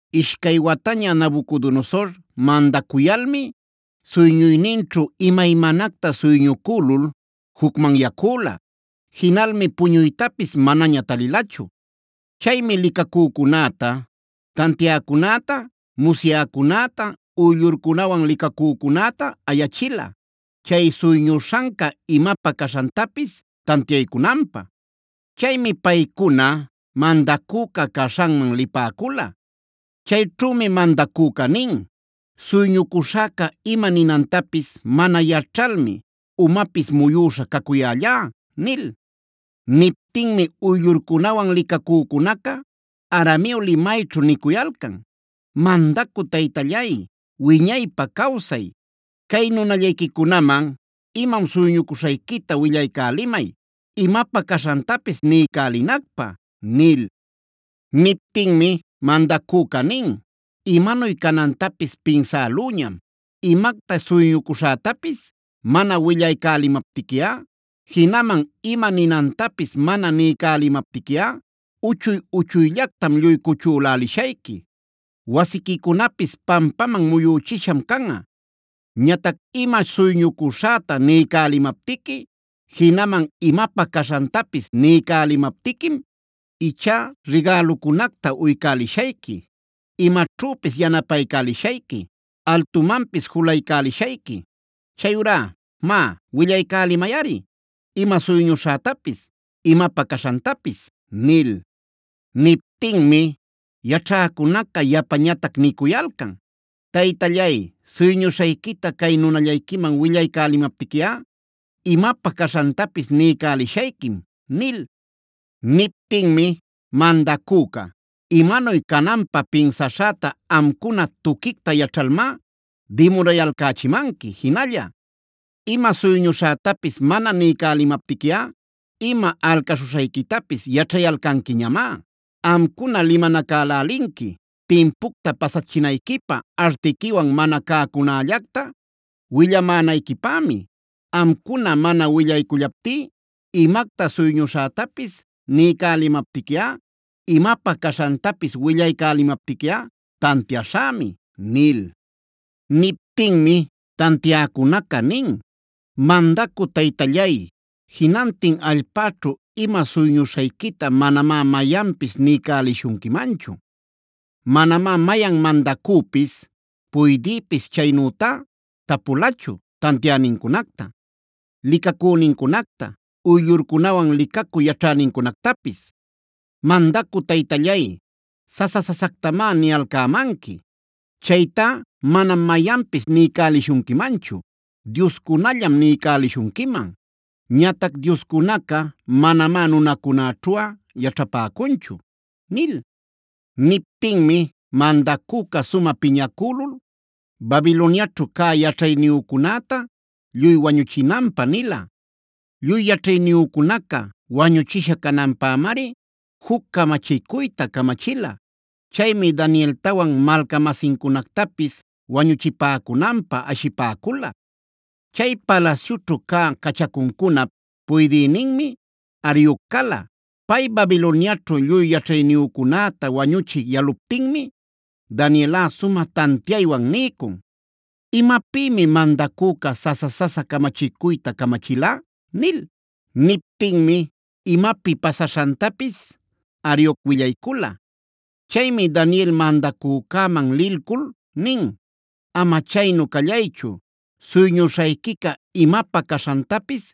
Ishcay wataña Nabucodonosor mandacuyalmi suyñuyninćhu imaymanacta suyñucülul jucmanyacüla. Jinalmi puñuytapis manaña talilachu. Chaymi licacücunäta, tantiäcunäta, musyäcunäta, uyllurcunawan licacücunätaa ayachila chay suyñuśhanca imapä caśhantapis tantiaycunanpä. Chaymi paycuna mandacüca caśhanman lipäcula. Chayćhümi mandacüca nin: “Suyñucuśhäca ima ninantapis mana yaćhalmi umapis muyüśha cacuyällá” nil. Niptinmi uyllurcunawan licacücunaca arameo limayćhu nicuyalcan: “Mandacü taytallay, wiñaypa cawsay. Cay nunallayquicunaman imam suyñucuśhayquita willaycälimay, imapä caśhantapis niycälinacpä” nil. Niptinmi mandacüca nin: “Imanuy canantapis pinsälüñam. Imacta suyñucuśhätapis mana willaycälimaptiquiꞌa, jinaman ima ninantapis mana niycälimaptiquiꞌa uchuy-uchuyllactam lluy cuchülächishayqui; wasiquicunapis pampaman muyüchisham canꞌa. Ñatac ima suyñucuśhäta niycälimaptiqui, jinaman imapä caśhantapis niycälimaptiquim ichá rigälucunacta uycälishayqui, imaćhüpis yanapaycälishayqui, altumanpis juluycälishayqui. Chayurá má, willaycälimayꞌari ima suyñuśhätapis, imapä caśhantapis” nil. Niptinmi yaćhäcunaca yapañatac nicuyalcan: “Taytallay, suyñuśhayquita cay nunallayquiman willaycälimaptiquiꞌa imapä caśhantapis niycälishayquim” nil. Niptinmi mandacüca: “Imanuy cananpä pinsaśhäta amcuna tuquicta yaćhalmá dimurayalcächimanqui jinalla. Ima suyñuśhätapis mana niycälimaptiquiꞌa ima alcaśhuśhayquitapis yaćhayalcanquiñamá. Amcuna limanacälälinqui timpucta pasachinayquipä artiquiwan mana cäcunällacta willamänayquipämi. Amcuna mana willaycullaptí imacta suyñuśhätapis niycälimaptiquiꞌa, imapä caśhantapis willaycälimaptiquiꞌa tantiaśhämi” nil. Niptinmi tantiäcunaca nin: “Mandacü taytallay, jinantin allpäćhu ima suyñuśhayquita manamá mayanpis niycälishunquimanchu. Manamá mayan mandacüpis, puydïpis chaynütá tapulachu tantiänincunacta, licacünincunacta, uyllurcunawan licacü yaćhänincunactapis. Mandacü taytallay, sasa-sasactamá niyalcämanqui. Chaytá manam mayanpis niycälishunquimanchu; dioscunallam niycälishunquiman. Ñatac dioscunaca manamá nunacunäćhuꞌa yaćhapäcunchu” nil. Niptinmi mandacüca sumä piñacülul Babiloniaćhu cä yaćhayniyücunäta lluy wañüchinanpä nila. Lluy yaćhayniyücunaca wañuchisha cananpämari juc camachicuyta camachila. Chaymi Danieltawan malca-masincunactapis wañuchipäcunanpä ashipäcula. Chay palasyućhu cä cachacuncunap puydïninmi Arioc cala. Pay Babiloniaćhu lluy yaćhayniyücunäta wañuchï yaluptinmi Danielꞌa sumä tantiaywan niycun: “¿Imapïmi mandacüca sasa-sasa camachicuyta camachila?” nil. Niptinmi imapi pasaśhantapis Arioc willaycula. Chaymi Daniel mandacücäman lilcul nin: “Ama chaynu callaychu, suyñuśhayquica imapä caśhantapis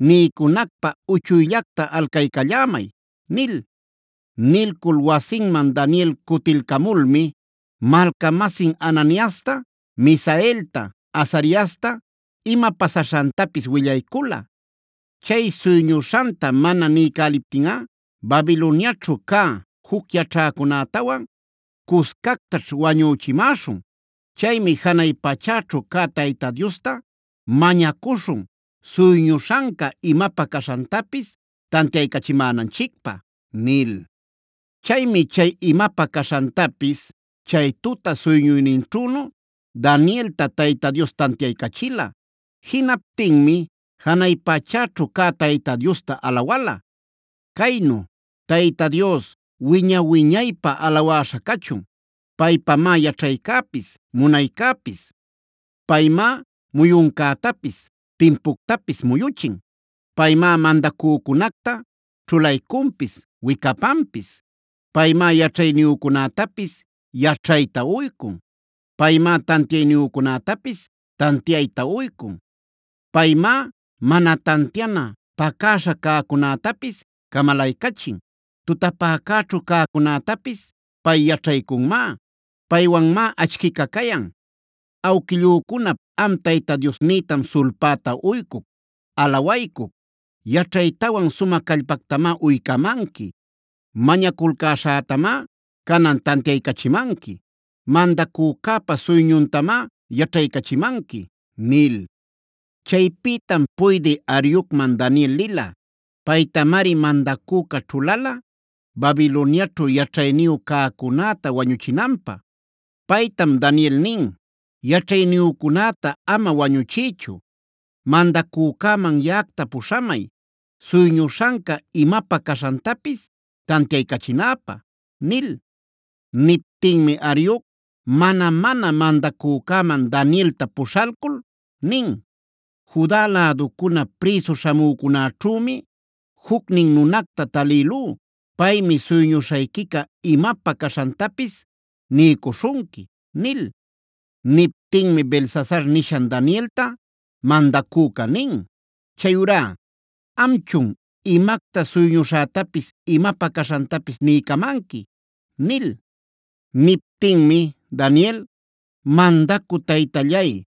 niycunacpä uchuyllacta alcaycallämay” nil. Nilcul wasinman Daniel cutilcamulmi malca-masin Ananiasta, Misaelta, Azariasta ima pasaśhantapis willaycula: “Chay suyñuśhanta mana niycäliptinꞌa Babiloniaćhu cä juc yaćhäcunätawan cuscactaśh wañüchimäśhun. Chaymi janay pachäćhu cä Tayta Diosta mañacuśhun suyñuśhanca imapä caśhantapis tantiaycachimänanchicpä” nil. Chaymi chay imapä caśhantapis chay tuta suyñuyninćhünu Danielta Tayta Dios tantiaycachila. Jinaptinmi janay pachäćhu cä Tayta Diosta alawala, caynu: “Tayta Dios, wiña-wiñaypä alawäśha cachun. Paypamá yaćhaycäpis, munaycäpis. Paymá muyuncätapis, timpuctapis muyuchin. Paymá mandacücunacta ćhulaycunpis wicapanpis. Paymá yaćhayniyücunätapis yaćhayta uycun. Paymá tantiayniyücunätapis tantiayta uycun. Paymá mana tantiana, pacäśha cäcunätapis camalaycachin. Tutapäcäćhu cäcunätapis pay yaćhaycunmá. Paywanmá achquica cayan. Awquillücunap am Tayta Diosnïtam sulpäta uycuc, alawaycuc. Yaćhaytawan sumä callpactamá uycamanqui. Mañaculcäśhätamá canan tantiaycachimanqui. Mandacücäpa suyñuntamá yaćhaycachimanqui” nil. Chaypïtam puydï Ariocman Daniel lila. Paytamari mandacüca ćhulala Babiloniaćhu yaćhayniyu cäcunäta wañuchinanpä. Paytam Daniel nin: “Yaćhayniyücunäta ama wañuchiychu. Mandacücäman yaꞌacta puśhamay suyñuśhanca imapä caśhantapis tantiaycachinäpä” nil. Niptinmi Arioc mana-mana mandacücäman Danielta puśhalcul nin: “Juda läducuna prïsu śhamücunäćhümi jucnin nunacta talïlú. Paymi suyñuśhayquica imapä caśhantapis niycuśhunqui” nil. Niptinmi Beltsasar nishan Danielta mandacüca nin: “Chayurá ¿amchun, imacta suyñuśhätapis, imapä caśhantapis niycamanqui?” nil. Niptinmi Daniel: “Mandacü taytallay,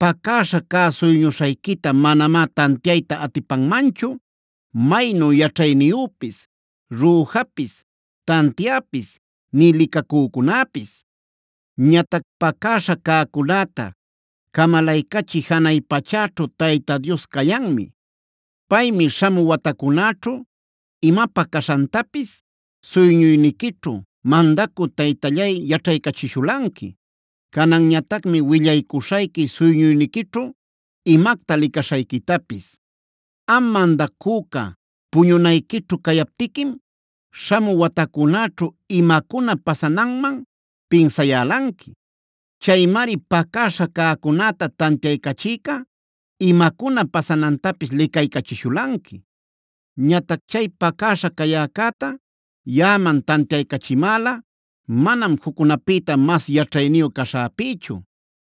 pacäśha cä suyñuśhayquita manamá tantiayta atipanmanchu maynu yaćhayniyüpis, rüjapis, tantiäpis, nï licacücunäpis. Ñatac pacäśha cäcunäta camalaycachï janay pachäćhu Tayta Dios cayanmi. Paymi śhamü watacunäćhu imapä caśhantapis suyñuyniquićhu mandacü taytallay yaćhaycachishulanqui. Cananñatacmi willaycuśhayqui suyñuyniquićhu imacta licaśhayquitapis. Am mandacüca, puñunayquićhu cayaptiquim śhamü watacunäćhu imacuna pasananman pinsayälanqui. Chaymari pacäśha cäcunäta tantiaycachïca imacuna pasanantapis licaycachishulanqui. Ñatac chay pacäśha cayäcäta yaꞌaman tantiaycachimäla manam juccunapïta mas yaćhayniyu caśhäpïchu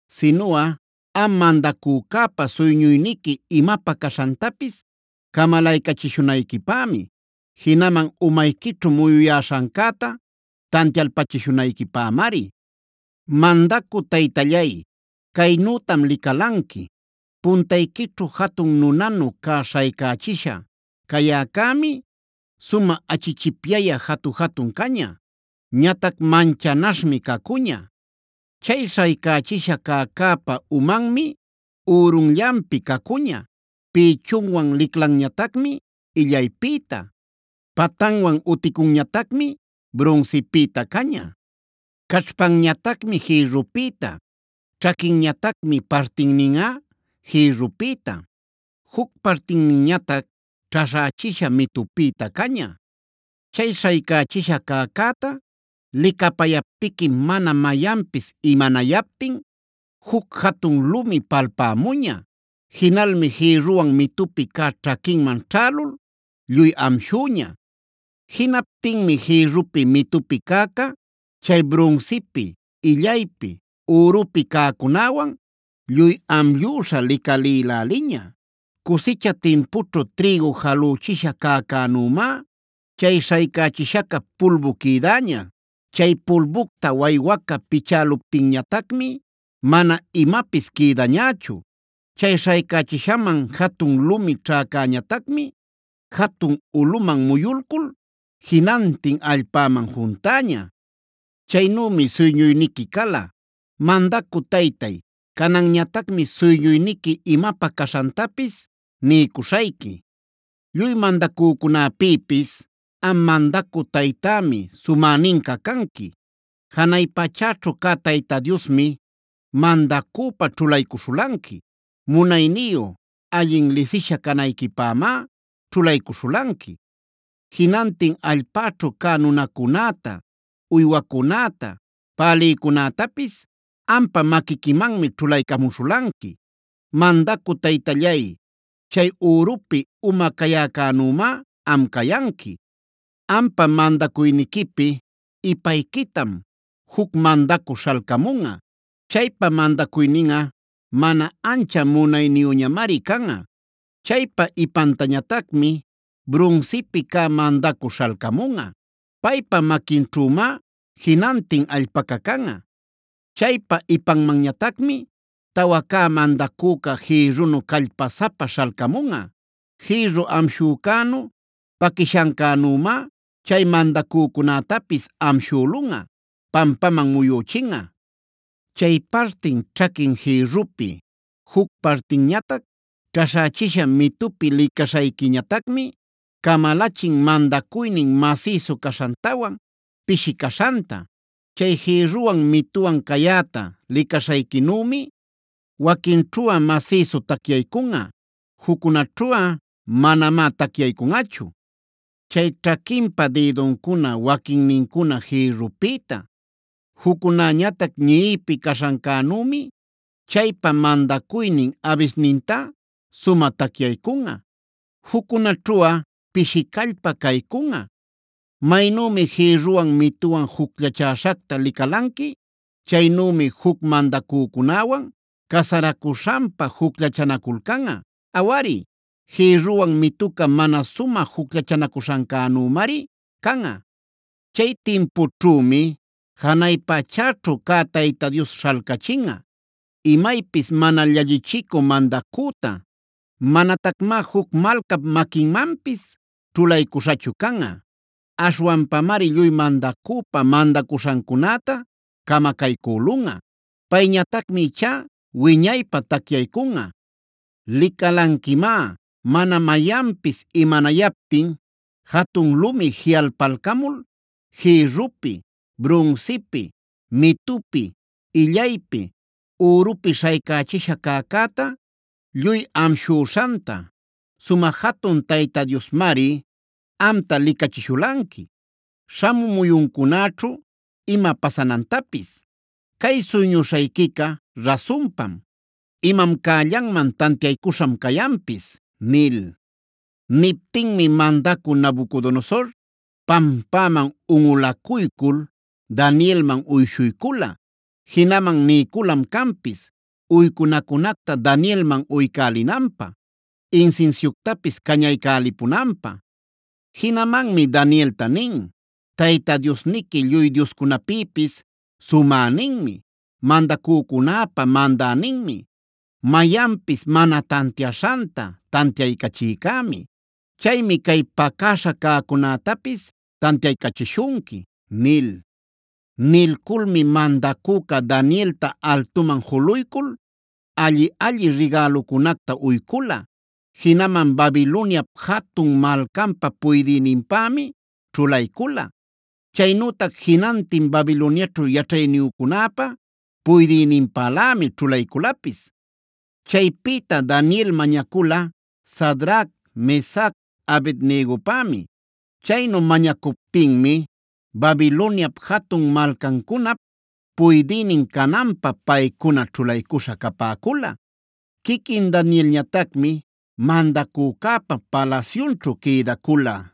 sinuꞌa am mandacücäpa suyñuyniqui imapä caśhantapis camalaycachishunayquipämi; jinaman umayquićhu muyuyäśhancäta tantialpachishunayquipämari. “Mandacü taytallay, caynütam licalanqui: puntayquićhu jatun nunanu cä śhaycächisha cayäcämi sumä achichipyayä jatu-jatun caña. Ñatac manchanaśhmi cacuña. Chay śhaycächisha cäcäpa umanmi ürunllanpi cacuña, pïchunwan liclanñatacmi illaypïta, patanwan uticunñatacmib brunsipïta caña. Caćhpanñatacmi jïrrupïta, ćhaquinñatacmi partinninꞌa jïrrupïta, juc partinninñatac ćhaśhächisha mitupïta caña. Chay śhaycächisha cäcäta licapayaptiquim mana mayanpis imanayaptin juc jatun lumi palpämuña. Jinalmi jïrruwan mitupi cä ćhaquinman ćhälul lluy amshüña. Jinaptinmi jïrrupi, mitupi cäca, chay brunsipi, illaypi, ürupi cäcunäwan lluy amllüśha licalïläliña. Cusicha timpućhu trïgu jalüchisha cäcänümá chay śhaycächishaca pulbu quïdäña. Chay pulbucta waywaca pichäluptinñatacmi mana imapis quïdañächu. Chay śhaycächishaman jatun lumi ćhäcäñatacmi jatun ulꞌuman muyulcul jinantin allpäman juntäña. “Chaynümi suyñuyniqui cala. Mandacü taytay, cananñatacmi suyñuyniqui imapä caśhantapis niycuśhayqui. Lluy mandacücunapïpis am mandacü taytämi sumäninca canqui. Janay pachäćhu cä Tayta Diosmi mandacüpa ćhulaycuśhulanqui; munayniyu, allin lisisha canayquipämá ćhulaycuśhulanqui. Jinantin allpäćhu cä nunacunäta, uywacunäta, pälïcunätapis ampa maquiquimanmi ćhulaycamuśhulanqui. Mandacü taytallay, chay ürupi uma cayäcänümá am cayanqui. “Ampa mandacuyniquipi ipayquitam juc mandacü śhalcamunꞌa. Chaypa mandacuyninꞌa mana ancha munayniyüñamari canꞌa. Chaypa ipantañatacmi brunsipi cä mandacü śhalcamunꞌa. Paypa maquinćhümá jinantin allpaca canꞌa. Chaypa ipanmanñatacmi tawa cä mandacüca jïrrunu callpasapa śhalcamunꞌa. Jïrru amshuśhancänu, paquishancänümá chay mandacücunätapis amshülunꞌa, pampaman muyüchinꞌa. “Chay partin ćhaquin jïrrupi, juc partinñatac ćhaśhächisha mitupi licaśhayquïñatacmi, camalachin mandacuynin masïsu caśhantawan pishi caśhanta. Chay jïrruwan mituwan cayäta licaśhayquinümi waquinćhuꞌa masïsu tacyaycunꞌa, juccunaćhuꞌa manamá tacyaycunꞌachu. Chay ćhaquinpa dïduncuna waquinnincuna jïrrupïta, juccunäñatac ñiꞌipi caśhancänümi chaypa mandacuynin abisnintá sumä tacyaycunꞌa, juccunaćhuꞌa pishi callpa caycunꞌa. Maynümi jïrruwan mituwan jucllachäśhacta licalanqui, chaynümi juc mandacücunäwan casaracuśhanpa jucllachanaculcanꞌa. Awari, jïrruwan mituca mana sumä jucllachanacuśhancänümari canꞌa. Chay timpućhümi janay pachäćhu cä Tayta Dios śhalcachinꞌa imaypis mana llallichicü mandacüta; mañatacmá juc malcap maquinmanpis ćhulaycuśhachu canꞌa. Aśhwanpamari lluy mandacüpa mandacuśhancunäta camacaycülunꞌa. Payñatacmi ichá wiñaypä tacyaycunꞌa. Licalanquimá mana mayanpis imanayaptin jatun lumi jiꞌalpalcamul jïrrupi, brunsipi, mitupi, illaypi, ürupi śhaycächisha cäcäta lluy amshüśhanta. Sumä jatun Tayta Diosmari amta licachishulanqui śhamü muyuncunäćhu ima pasanantapis. Cay suyñuśhayquica rasunpam; imam cällanman tantiaycuśham cayanpis” nil. Niptinmi mandacü Nabucodonosor pampäman unꞌulacuycul Danielman uyshuycula. Jinaman niyculam canpis uycunacunacta Danielman uycälinanpä, insinsiuctapis cañaycälipunanpä. Jinamanmi Danielta nin: “Tayta Diosniqui lluy dioscunapïpis sumäninmi; mandacücunäpa mandäninmi; mayanpis mana tantiaśhanta tantiaycachïcämi. Chaymi cay pacäśha cäcunätapis tantiaycachishunqui” nil. Nilculmi mandacüca Danielta altuman juluycul alli-alli rigälucunacta uycula. Jinaman Babiloniap jatun malcanpä puydïninpämi ćhulaycula. Chaynütac jinantin Babiloniaćhu yaćhayniyücunäpa puydïninpälämi ćhulayculapis. Chaypïta Daniel mañacula Sadrac, Mesac, Abed-negopämi. Chaynu mañacuptinmi Babiloniap jatun malcancunap puydïnin cananpä paycuna ćhulaycuśha capäcula. Quiquin Danielñatacmi mandacücäpa palasyunćhu quïdacula.